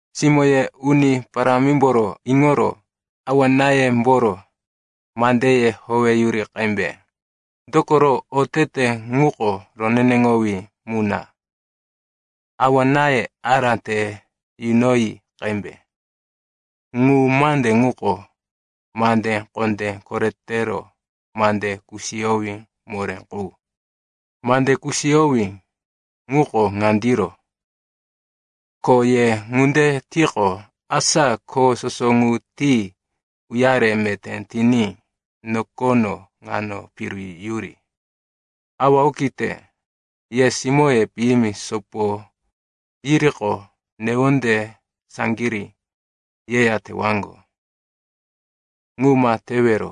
Simó, ye Uni Parámimboro iŋoro awa-náyemboro mandeye howeyuri qembe. Dokoro otete ŋuko roneneŋowí mu na. “Awa-náye ará te yunoyi qembe.” Ŋu mande ŋuko mande kondé koretero mande kusiyowí moré qu. Mande kusiyowí ŋuko ŋandiro, “Ko ye ŋunde tiqo, asa kho soso ŋu ti uyare meté tiní nokono ŋano piru yuri.” Awa okite, ye simóye piyimi sopo yiriqo, newonde saŋgirí yeya tewaŋgo. Ŋu ma tewero.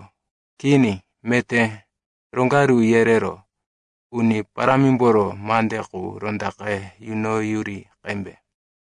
Kini, meté roŋgaru yerero Uni Parámimboro mande qu rondaqe yunoyuri qembe.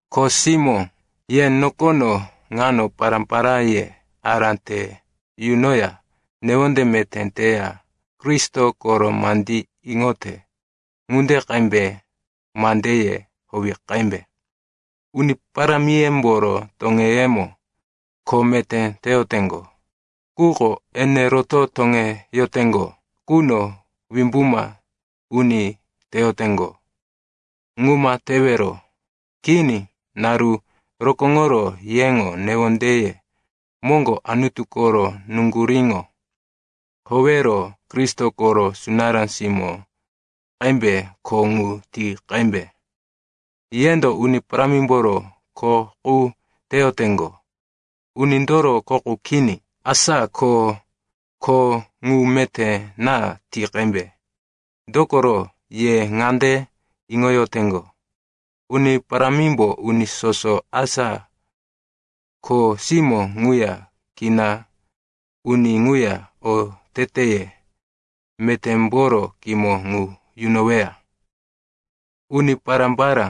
Kho simó, ye nokono ŋano pará-paráye ará te yunoya newonde meté teya Kristo koro mandí iŋote ŋunde qembe mandeye howi qembe. Uni parámiyemboro toŋeyemo kho meté teyoteŋgo, quko ene roto toŋeyoteŋgo quno wimbuma uni teyoteŋgo. Ŋu ma tewero. Kini, naru rokóŋoro yeŋo newondeye moŋgo Anutu koro nuŋguríŋo howero Kristo koro sunará simó qembe kho ŋu ti qembe. Yendo Uni Parámimboro kho qu teyoteŋgo, unindoro kho qu kini. Asa ko kho ŋu meté na ti qembe. Dokoro ye ŋande iŋoyoteŋgo, Uni Parámimbo uni soso, asa kho simó ŋuya kina uni ŋuya, oteteye metémboro kimo ŋu yunoweya. Uni pará-pará,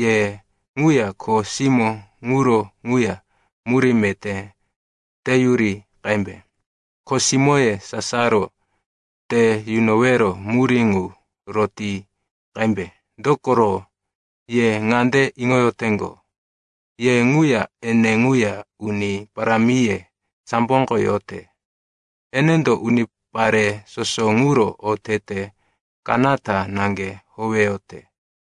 ye ŋuya kho simó ŋuro ŋuya murí meté teyuri qembe. Kho simóye sasaro te yunowero murí ŋu roti qembe. Dokoro ye ŋande iŋoyoteŋgo, ye ŋuya ene ŋuya Uni Parámiye samboko yote. Enendo unipare soso ŋuro otete kanata naŋge howeyote.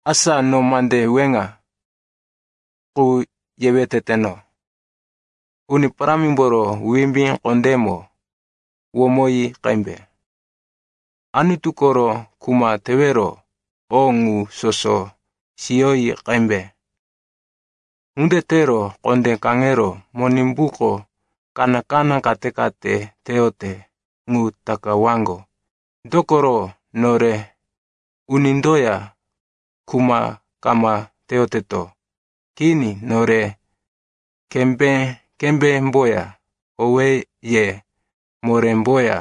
Asa no mande weŋa qu yewe teteno, Uni Parámimboro wimbí kondémo womoyi qembe. Anutu koro kuma tewero o ŋu soso siyoyi qembe. Ŋunde tero kondé kaŋero Monimbuko kaná-kaná kate-kate teyote ŋu takawaŋgo. Dokoro nore unindoya kuma kama teyoteto. Kini, nore kembé-kembémboya, owéye morémboya,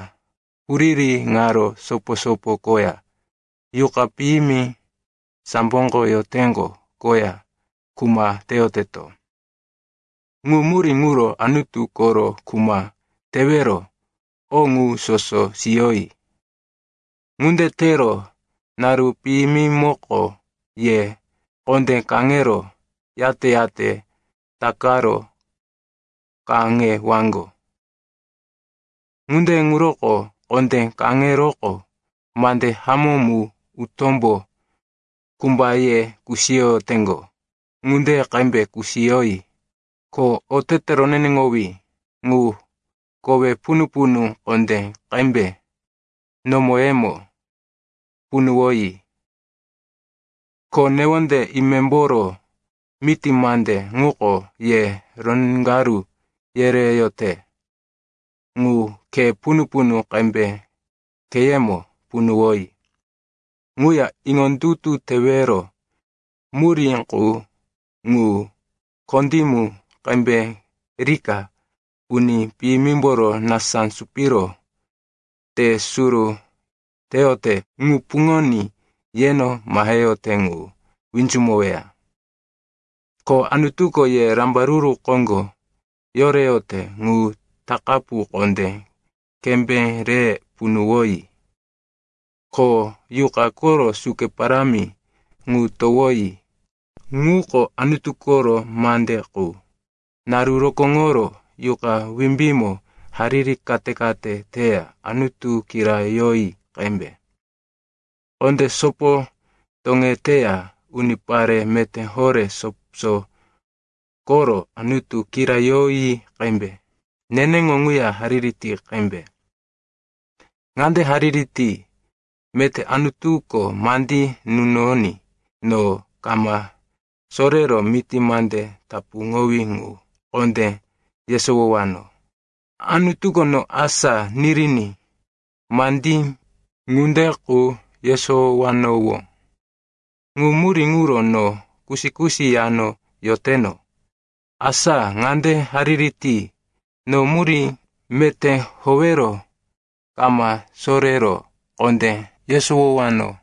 huriri ŋaro sopo-sopo koya, yuqa piyimi samboko yoteŋgo koya kuma teyoteto. Ŋu murí ŋuro Anutu koro kuma tewero o ŋu soso siyoyi. Ŋunde tero naru piyimimoko ye kondé kaŋero, yate-yate takaro kaŋewaŋgo. Ŋunde ŋuroko kondé kaŋeroqo, mande hamó mu utómbo kumbaye kusiyoteŋgo ŋunde qembe kusiyoyi. Ko otete roneneŋowí ŋu kowe punu-punu kondé qembe nomoyemo punuwoyi. Ko newonde imemboro miti mande ŋuko ye roŋgaru yereyote ŋu khe punu-punu qembe kheyemo punuwoyi. Ŋuya iŋondutu tewero murí qu ŋu kondímu qembe rika uni piyimimboro nasá supiro te suru teyote ŋu puŋoní yeno maheyote ŋu winzumoweya. Ko Anutuko ye rambaruru koŋgo yoreyote ŋu takapu kondé qembe re punuwoyi. Ko Yuqa koro suke parámi ŋu towoyi, ŋuko Anutu koro mande qu. Naru rokóŋoro Yuqa wimbímo hariri kate-kate teya Anutu kirayoyi qembe. Kondé sopo toŋeteya unipare meté horé soso koro Anutu kirayoyi qembe. Neneŋo ŋuya hariri ti qembe. Ŋande hariri ti, meté Anutuko mandí nunoní no kama sorero miti mande tapuŋowí ŋu kondé yesowowano. Anutuko no asá niriní mandí ŋunde qu yesowanowó. Ŋu murí ŋuro no kusi-kusi yano yoteno. Asa ŋande hariri ti, no murí meté howero kama sorero kondé yesowowano.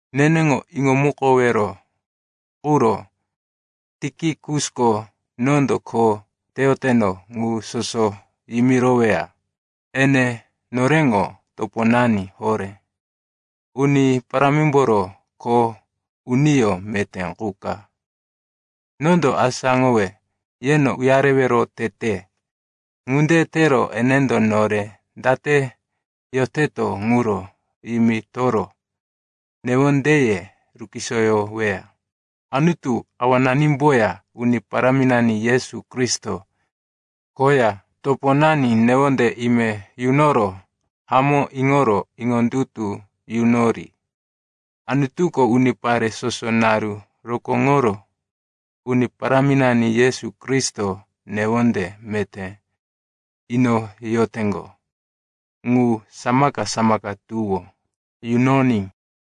Neneŋo iŋomukowero quro Tikikusko nondo kho teyoteno ŋu soso yimiroweya. Ene noreŋo toponani horé, Uni Parámimboro kho uniyó meté qu ka. Nondo asáŋowe yeno uyarewero tete. Ŋunde tero enendo nore date yoteto ŋuro yimitoro newondeye rukisoyoweya. Anutu Awananimboya Uni Paráminani Yesu Kristo koya toponani newonde ime yunoro hamó iŋoro iŋondutu yunori. Anutuko unipare soso naru rokóŋoro Uni Paráminani Yesu Kristo newonde meté inoyoteŋgo ŋu samaka-samaka tuwó yunoní.